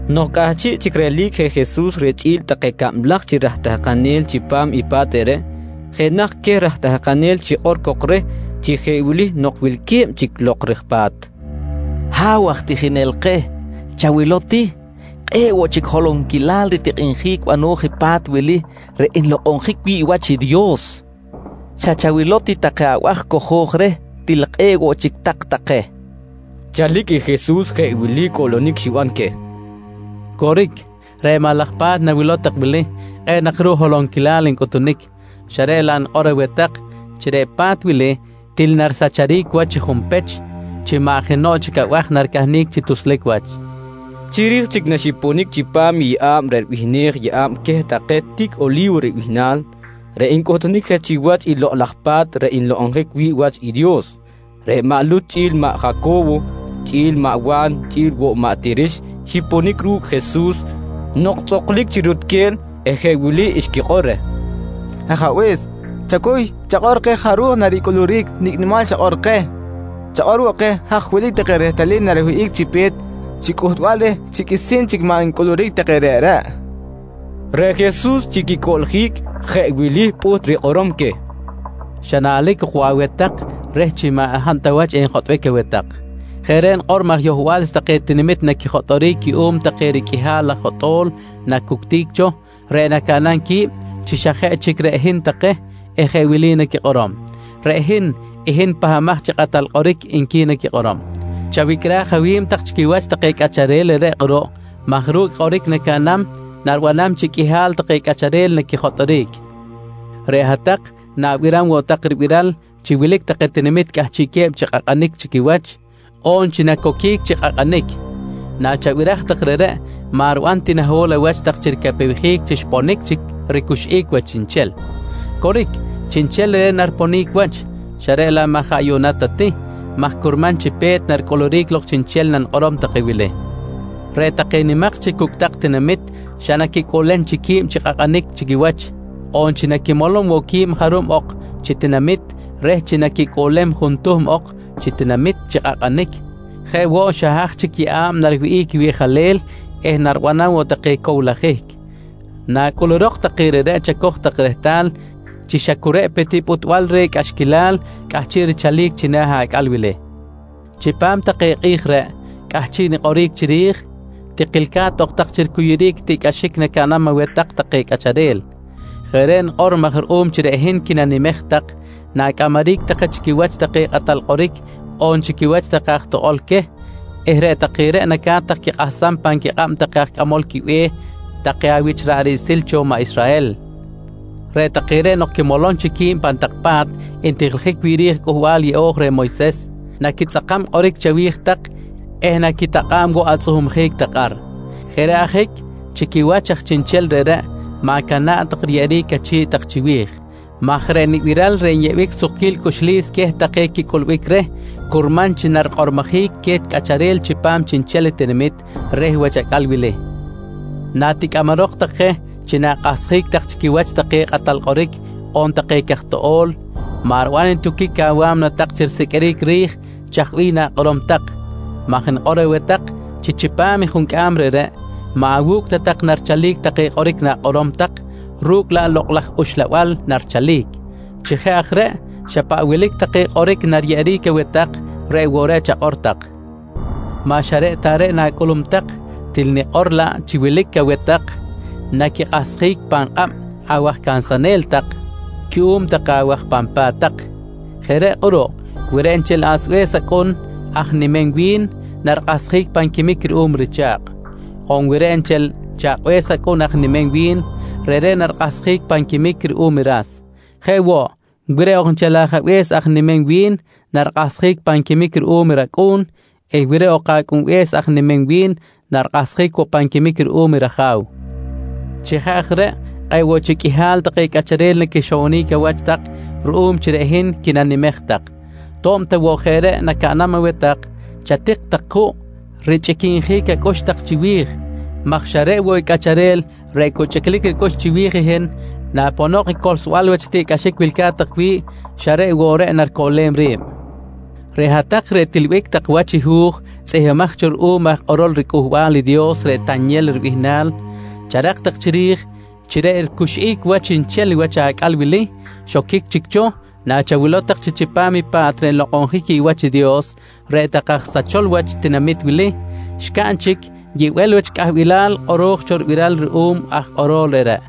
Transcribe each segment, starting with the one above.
Nok cꞌahchiꞌ chic relic je Jesus richꞌi̱l take cablaj chi raj tahkanel chipam i pa̱t reꞌreꞌ, jenaj queh raj tahkanel xikꞌor cok reh chi jeꞌ wili nok wilque̱b chic lok rij pa̱t: «Ha̱w aj tijinel keh, chawilow ti! Kꞌe̱ꞌ woꞌ chic holonquilal ritikꞌinjic bano̱j i pa̱t wili reꞌ nlokꞌonjic wi̱ꞌ wach i Dios! Xa chawilow ti take abaj cojo̱j reh, til kꞌe̱ꞌ woꞌ chic tak take, nqui reh. Chalic i Jesus jeꞌ wili cꞌuꞌlunic xiban queh: «Coric, reꞌ maꞌ laj pa̱t nawilom tak wili kꞌe̱ꞌ nak ruꞌ holonquilal ncꞌutunic, xa reꞌ laꞌ nikꞌor aweh tak chi reꞌ pa̱t wili til narisacharic wach chi junpech chi maꞌ jenoꞌ chic abaj naricahnic chi tuslic wach, nqui xikꞌor. Chiri̱j chic naxiponic chipam i yeꞌa̱b reꞌ ribihnej “Yeꞌa̱b queh take tic Oli̱wo ribihnal”, reꞌ ncꞌutunic je chiwach i Lokꞌ laj Pa̱t reꞌ nlokꞌonjic wi̱ꞌ wach i Dios, reꞌ maꞌ Luch chꞌi̱l i maꞌ Jaco̱wo chꞌi̱l maꞌ Wa̱n chꞌi̱l woꞌ maꞌ Tirix xiponic ru̱cꞌ Jesus nok tzꞌuklic chi rutquel eh jeꞌ wili xquikꞌor reh: «Ajabe̱s, chacuy chakꞌor keh jaruj naricꞌuluric nicꞌ nimal xakꞌor keh. Chakꞌor woꞌ keh haj wilic take rehtalil nariwihꞌic chi pe̱t chi cꞌuhtbal reh chi qꞌuisi̱n chic maꞌ ncꞌuluric take reꞌreꞌ, nqui take reh. Reꞌ Jesus chi quicꞌuꞌljic jeꞌ wili pꞌuht rikꞌorom queh: «Xa naꞌlic ok woꞌ aweh tak reh chi maꞌ hab ta wach enjotꞌbic aweh tak. Jeꞌ reꞌ nikꞌor maj yohbal wach take tinamit naquijotꞌoric cuꞌum take riqꞌuihal aj jotꞌo̱l nacuctic cho reꞌ nacaꞌnam qui̱b chi xa jeꞌ chic reꞌ hin take eh jeꞌ wili naquikꞌorom: ‹Reꞌ hin, i hin Pahbamaj chi Kꞌatal Kꞌoric, nqui naquikꞌorom. «Chawicꞌraj awi̱b tak chi quiwach take cꞌacharel reꞌreꞌ kꞌuruꞌ maj ru̱cꞌ i kꞌoric nacaꞌnam, naribanam chi qꞌuihal take cꞌacharel naquijotꞌoric. «Reꞌ hat-tak na̱biram woꞌ tak ribiral chi wilic take tinamit cꞌahchiꞌque̱b chi kꞌakꞌanic chi quiwach on chi nacoquic chi kꞌakꞌanic. Nachabiraj tak reꞌreꞌ, maꞌ riban ti naho̱l awach tak chi ricapewjic chi xponic chic ricuxꞌic wach chiꞌnchel. Coric, chiꞌnchel reꞌreꞌ nariponic wach xa reꞌ laꞌ maꞌ jaꞌ yuꞌna ta ti maj curman chi pe̱t naricꞌuluric chiꞌnchel nanikꞌorom take wili: Reꞌ take nimak chi cucꞌtak tinamit xa naquicꞌuꞌlem chic qui̱b chi kꞌakꞌanic chi quiwach on chi naquimolom woꞌ qui̱b jarub ok chi tinamit reh chi naquicꞌuꞌlem juntuhm ok chi tinamit chi kꞌakꞌanic. Jeꞌ woꞌ xa haj chic yeꞌa̱b, nariwihꞌic wiꞌjalel eh naribanam woꞌ take cow laj hihc. Nacꞌulurok take reꞌreꞌ chacoj tak rehtal chi xa cu reꞌ pe ti pꞌuhtbal reh i cꞌaxquilal cꞌahchiꞌ richalic china̱ acꞌal wili. «Chipam take kꞌi̱j reꞌ cꞌahchiꞌ nikꞌoric chiri̱j, tikilca̱t ok tak chi ricuyuric i tiꞌcꞌaxic nacaꞌnam aweh tak take cꞌacharel. Jeꞌ reꞌ nikꞌor maj ruꞌum chi reꞌ hin quinanimej tak, na̱cꞌamaric tak je chi quiwach take kꞌatal kꞌoric on chi quiwach take aj toꞌo̱l queh eh reꞌ take reꞌ naca̱t tak quikꞌahsam pan quikꞌab take aj cꞌamol quibe̱h take awich ra̱ꞌ riꞌsil cho maꞌ Israhel. Reꞌ take reꞌ nok quimolom chic qui̱b pan tak pa̱t ntijiljic wi̱ꞌ ri̱j i Cꞌuhbal Yeꞌo̱j reh Moyses, naquitzꞌakam kꞌoric chawi̱j tak eh naquitakꞌa̱b woꞌ atzꞌuhumjic tak ar. Jeꞌ reꞌ ajic chi quiwach aj chiꞌnchel reꞌreꞌ ma̱cana̱ꞌ tak riyeꞌeric achi̱ꞌ tak chiwi̱j maj reꞌ nibiral reꞌ nyeꞌbic sukquil cꞌuxlis queh take quicꞌulbic reh, curman chi narikꞌormojic queh cꞌacharel chipam chiꞌnchel tinamit reh wach acꞌal wili. «Naticꞌamarok tak je chi na̱kꞌahsjic tak chi quiwach take kꞌatal kꞌoric on take caj toꞌo̱l, maꞌ riban ntuquic awa̱mna tak chi risiqꞌuiric ri̱j chaj bih na̱kꞌorom tak maj nikꞌor aweh tak chi chipam i juncꞌam reꞌreꞌ, maꞌ awu̱cꞌ ta tak narichalic take kꞌoric na̱kꞌorom tak, ru̱cꞌ laꞌ i Lokꞌ laj Uxlabal narichalic. Chi jeꞌ aj reꞌ xa paꞌ wilic take kꞌoric nariyeꞌeric aweh tak, reꞌ woꞌ reꞌ chakꞌor tak. «Maꞌ xa reꞌ ta reꞌ na̱cꞌulum tak, til nikꞌor laꞌ chi wilic aweh tak naquikꞌahsjic pan kꞌab awaj cansanel tak cuꞌum take awaj pan pa̱t tak. Jeꞌ reꞌ kꞌuruꞌ, wi reꞌ nchel asbe̱s acꞌun aj nimem wi̱n, narikꞌahsjic pan quimic ruꞌum richa̱kꞌ. On wi reꞌ nchel i chakꞌbe̱s acꞌun aj nimem wi̱n, reꞌreꞌ, narikꞌahsjic pan quimic ruꞌum i ras. Jeꞌ woꞌ, wi reꞌ ok nchel ajabe̱s aj nimem wi̱n, narikꞌahsjic pan quimic ruꞌum i racꞌu̱n eh wi reꞌ ok acꞌunbe̱s aj nimem wi̱n, narikꞌahsjic woꞌ pan quimic ruꞌum i raja̱w. Chi jeꞌ aj reꞌ kꞌe̱ꞌ woꞌ chic qꞌuihal take cꞌacharel naquixowonic awach tak ruꞌum chi reꞌ hin quinanimej tak. To̱b ta woꞌ jeꞌ reꞌ nacaꞌnam aweh tak, chatik tak juꞌ richꞌiquinjic acꞌux tak chiwi̱j maj xa reꞌ woꞌ i cꞌacharel reꞌ cu chꞌiclic ricꞌux chiwi̱j hin naponok i cohlsbal wach i tiꞌcꞌaxic wilca̱t tak wi̱ꞌ, xa reꞌ woꞌ reꞌ naricoꞌlem ri̱b. «Reꞌ hat-tak reꞌ tilbic tak wach i hu̱j tzꞌihmbimaj cho ruꞌum aj kꞌorol riCꞌuhbal i Dios reꞌ Tanyel ribihnal, charak tak chiri̱j chi reꞌ ricuxꞌic wach chiꞌnchel i wach acꞌal wili xoquic chic cho nachawilow tak chi chipam i pa̱t reꞌ nlokꞌonjic wi̱ꞌ wach i Dios, reꞌ take aj sachol wach i tinamit wili, xcaꞌn chic i yibel wach cꞌahbilal kꞌoro̱j cho ribiral ruꞌum i aj kꞌorol reꞌreꞌ.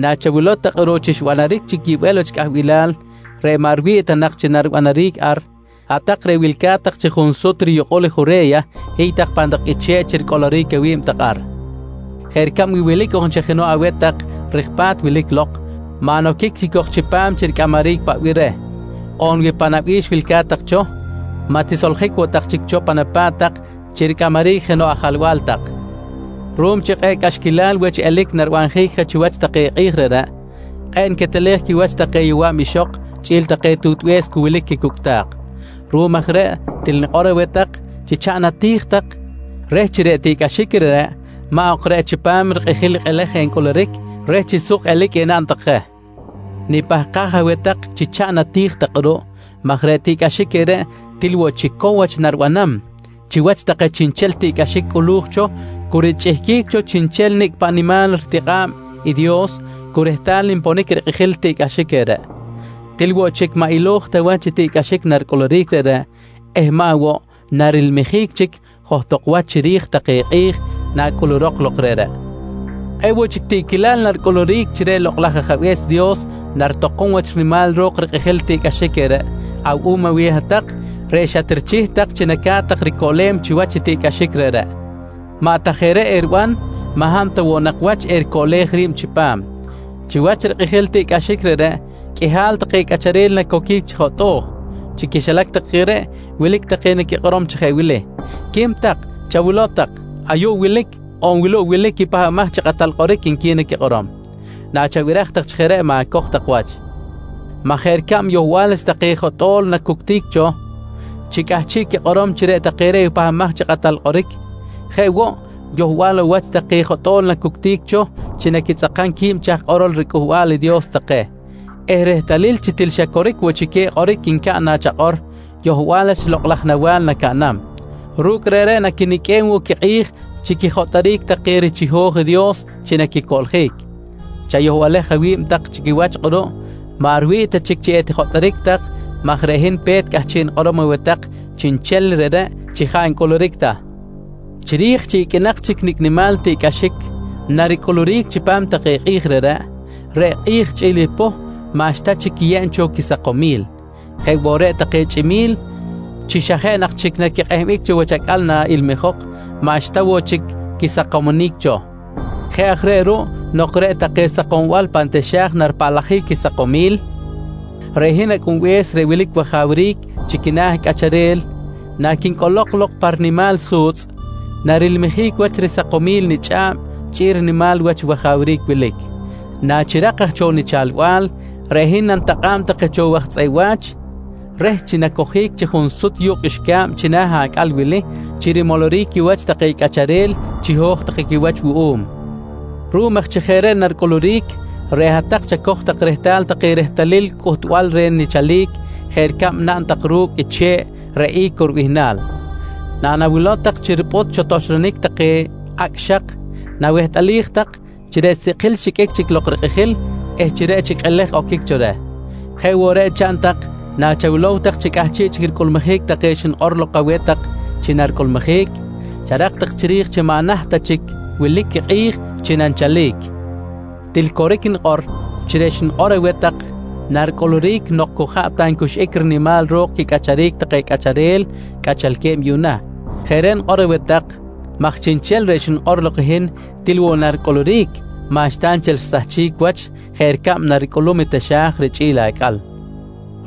Nachawilow tak kꞌuruꞌ chi xbanaric chic i yibel wach cꞌahbilal reꞌ maꞌ riwi̱ꞌ ta nak chi naribanaric ar, hat-tak reꞌ wilca̱t tak chi junsut riyukꞌul Jure̱ya hiy tak pan tak qꞌuiche̱ꞌ chi ricꞌoloric awi̱b tak ar. Jeꞌ ricab wi wilic ok nchel jenoꞌ aweh tak rij ripa̱t wilic lok, maꞌ noquic chic cok chipam chi ricꞌamaric paꞌ bih reh. On wi pan awabi̱x wilca̱t tak cho maꞌ tisoljic woꞌ tak chic cho pan apa̱t tak chi ricꞌamaric jenoꞌ ajalba̱l tak. Ruꞌum chi kꞌe̱ꞌ cꞌaxquilal wach i elic naribanjic chiwach take kꞌi̱j reꞌreꞌ, kꞌe̱ꞌ niquetelej quiwach take yowa̱b ixok chꞌi̱l take tutbe̱s cu wilic quicucꞌta̱k. Ruꞌum aj reꞌ, til nikꞌor aweh tak chi chaꞌn ati̱j tak reh chi reꞌ tiꞌcꞌaxic reꞌreꞌ maꞌ ok reꞌ chipam rikꞌijil i kꞌelej encꞌuluric reh chi suk elic enaꞌn tak je. Nipahkaj aweh tak chi chaꞌn ati̱j tak kꞌuruꞌ maj reꞌ tiꞌcꞌaxic reꞌreꞌ til woꞌ chic cow wach naribanam chiwach take chiꞌnchel tiꞌcꞌaxic cꞌulu̱j cho cu richꞌihquic cho chiꞌnchel nicꞌ paꞌ nimal ritikꞌa̱b i Dios cu rehtal nponic rikꞌijil i tiꞌcꞌaxic reꞌreꞌ. Til woꞌ chic maꞌ ilo̱j ta wach i tiꞌcꞌaxic naricꞌuluric reꞌreꞌ eh maꞌ woꞌ narilmijic chic johtok wach chiri̱j take kꞌi̱j nacꞌulurok lok reꞌreꞌ. Kꞌe̱ꞌ woꞌ chic tiꞌquilal naricꞌuluric chi reꞌ Lokꞌ laj Ajabe̱s Dios naritokom wach rinimal ro̱k rikꞌijil tiꞌcꞌaxic reꞌreꞌ awuꞌum aweh hat-tak reꞌ xatrichih tak chi naca̱t tak ricoꞌlem chiwach i tiꞌcꞌaxic reꞌreꞌ. Maꞌ ta jeꞌ reꞌ eriban, maꞌ hab ta woꞌ nak wach ericoꞌlej ri̱b chipam. Chiwach rikꞌijil i tiꞌcꞌaxic reꞌreꞌ, qꞌuihal take cꞌacharel nacoquic chi jotꞌo̱j. Chi quixilac take reꞌ, wilic take naquikꞌorom chi jeꞌ wili: ‹Quim tak, chawilow tak: Ayuꞌ wilic on wuluꞌ wilic i Pahbamaj chi Kꞌatal Kꞌoric, nqui naquikꞌorom. «Nachabiraj tak chi jeꞌ reꞌ ma̱coj tak wach maj jeꞌ ricab yohbal wach take jotꞌo̱l nacuctic cho chi cꞌahchiꞌ quikꞌorom chi reꞌ take reꞌ i Pahbamaj chi Kꞌatal Kꞌoric. Jeꞌ woꞌ, yohbal woꞌ wach take jotꞌo̱l nacuctic cho chi naquitzꞌakam qui̱b aj kꞌorol riCꞌuhbal i Dios take eh rehtalil chi til xa coric woꞌ chic queh kꞌoric ncaꞌn nachakꞌor, yohbal wach lokꞌ laj nawa̱l nacaꞌnam. Ru̱cꞌ reꞌreꞌ naquiniqꞌuem woꞌ quikꞌi̱j chi quijotꞌoric take richiho̱j i Dios chi naquicoꞌljic. Chayohbalej awi̱b tak chi quiwach kꞌuruꞌ, maꞌ riwi̱ꞌ ta chic chi etijotꞌoric tak maj reꞌ hin pe̱t cꞌahchiꞌ nikꞌorom aweh tak chiꞌnchel reꞌreꞌ chi jaꞌ ncꞌuluric ta. «Chiri̱j chi iqꞌuinak chic nicꞌ nimal tiꞌcꞌaxic naricꞌuluric chipam take kꞌi̱j reꞌreꞌ, reꞌ kꞌi̱j chꞌi̱l i poh maꞌxta chic quiyeb cho quisakomil. Jeꞌ woꞌ reꞌ take chꞌimi̱l, chi xa jeꞌ nak chic naquikꞌehbic cho wach acꞌal naꞌilmijok, maꞌxta woꞌ chic quisakomonic cho. Jeꞌ aj reꞌ ruꞌ nok reꞌ take sakombal pan taxa̱j naripaꞌlajic quisakomil, reꞌ hin Acꞌunbe̱s reꞌ wilic wajawric chi quina̱ cꞌacharel naquincꞌolok lok pa rinimal su̱tzꞌ, narilmijic wach risakomil nichꞌa̱b chꞌi̱l rinimal wach wajawric wilic. Nachirak aj cho nichalbal, reꞌ hin nanitakꞌa̱b take cho waj tzꞌeꞌ wa̱ch reh chi nacojic chi junsut yu̱kꞌ qꞌuixca̱b china̱ acꞌal wili chi rimoloric quiwach take cꞌacharel chiho̱j take quiwach wuꞌum. «Ruꞌum aj chi jeꞌ reꞌ naricꞌuluric, reꞌ hat-tak chacoj tak rehtal take rehtalil cꞌuhtbal reh nichalic jeꞌ ricab naꞌn tak ru̱cꞌ i che̱ꞌ reꞌ I̱co ribihnal. Nanawilow tak chi ripꞌut cho toxlonic take acꞌ xak, nawehtꞌalij tak chi reꞌ sikꞌjil xiqꞌuic chic lok rikꞌijil eh chi reꞌ chic kꞌelej oquic cho reh. Jeꞌ woꞌ reꞌ chaꞌn tak chi nachawilow tak chi cꞌahchiꞌ chic ricꞌulmujic take xnikꞌor lok aweh tak chi naricꞌulmujic, charak tak chiri̱j chi maꞌ naht ta chic wilic i kꞌi̱j chi nanichalic. Til coric nikꞌor chi reꞌ xnikꞌor aweh tak naricꞌuluric nok cu jaꞌ ta ncuxꞌic rinimal ro̱k quicꞌacharic take cꞌacharel cꞌachalque̱b yuꞌna. Jeꞌ reꞌ nikꞌor aweh tak maj chiꞌnchel reꞌ xnikꞌor lok i hin, til woꞌ naricꞌuluric maꞌxta nchel risahchic wach jeꞌ ricab naricꞌulum i taxa̱j richꞌi̱l i acꞌal.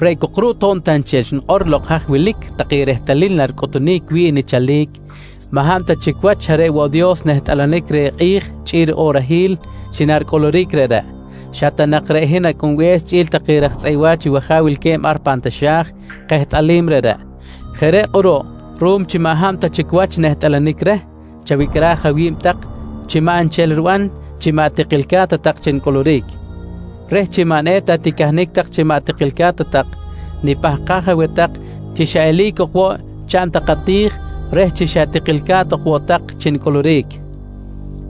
«Reꞌ cok ruꞌ to̱b ta nchel xnikꞌor lok haj wilic take rehtalil naricꞌutunic wi̱ꞌ nichalic, maꞌ hab ta chic wach xa reꞌ woꞌ Dios nehtꞌalanic reh kꞌi̱j chꞌi̱l riꞌorahil chi naricꞌuluric reꞌreꞌ. Xa ta nak reꞌ hin Acꞌunbe̱s chꞌi̱l take raj tzꞌeꞌ wa̱ch i wAja̱w wilque̱b ar pan taxa̱j, kehtꞌalim reꞌreꞌ. Jeꞌ reꞌ kꞌuruꞌ ruꞌum chi maꞌ hab ta chic wach nehtꞌalanic reh, chawicꞌraj awi̱b tak chi maꞌ nchel riban chi maꞌ tikilca̱t ta tak chi nicꞌuluric. Reh chi maꞌ eta tican tak chi maꞌ tikilca̱t ta tak, nipahkaj aweh tak chi xa eli̱c ok woꞌ chaꞌn tak ati̱j reh chi xa tikilca̱t ok woꞌ tak chi nicꞌuluric.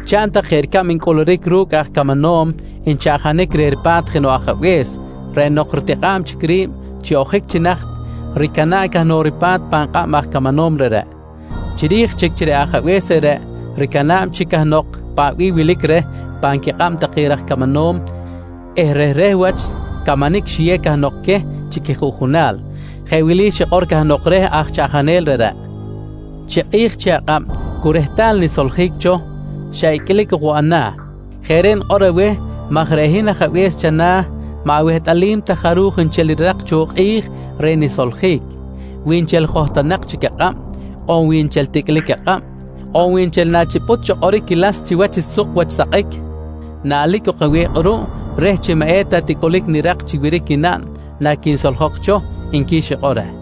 Chaꞌn tak jeꞌ ricab ncꞌuluric ru̱cꞌ aj camanom nchaꞌjanic reh ripa̱t jenoꞌ ajabe̱s reꞌ nok ritikꞌa̱b chic ri̱b chi ojic chi naht, ricana̱ꞌ cahnok ripa̱t pan kꞌab aj camanom reꞌreꞌ. Chiri̱j chic chi reꞌ ajabe̱s reꞌreꞌ ricana̱b chic cahnok paꞌ bih wilic reh pan quikꞌab take raj camanom eh rehreh wach camanic xiyew cahnok queh chi quijuꞌjunal, jeꞌ wili xikꞌor cahnok reh aj chaꞌjanel reꞌreꞌ: ‹Chi kꞌi̱j chi akꞌab cu rehtal nisoljic cho, xa icꞌlic ok woꞌ ana̱. Jeꞌ reꞌ nikꞌor aweh maj reꞌ hin ajabe̱s chana̱, maꞌ awehtꞌalim ta jaruj nchel rirak cho kꞌi̱j reh nisoljic, wi nchel johtonak chic akꞌab, on wi nchel ticꞌlic akꞌab, on wi nchel nachipꞌut cho kꞌoric i las chiwach i suk wach sakꞌic. Naꞌlic ok aweh kꞌuruꞌ reh chi maꞌ eta ticꞌulic nirak chi wiric naꞌn naquinsoljok cho, nqui xikꞌor reh.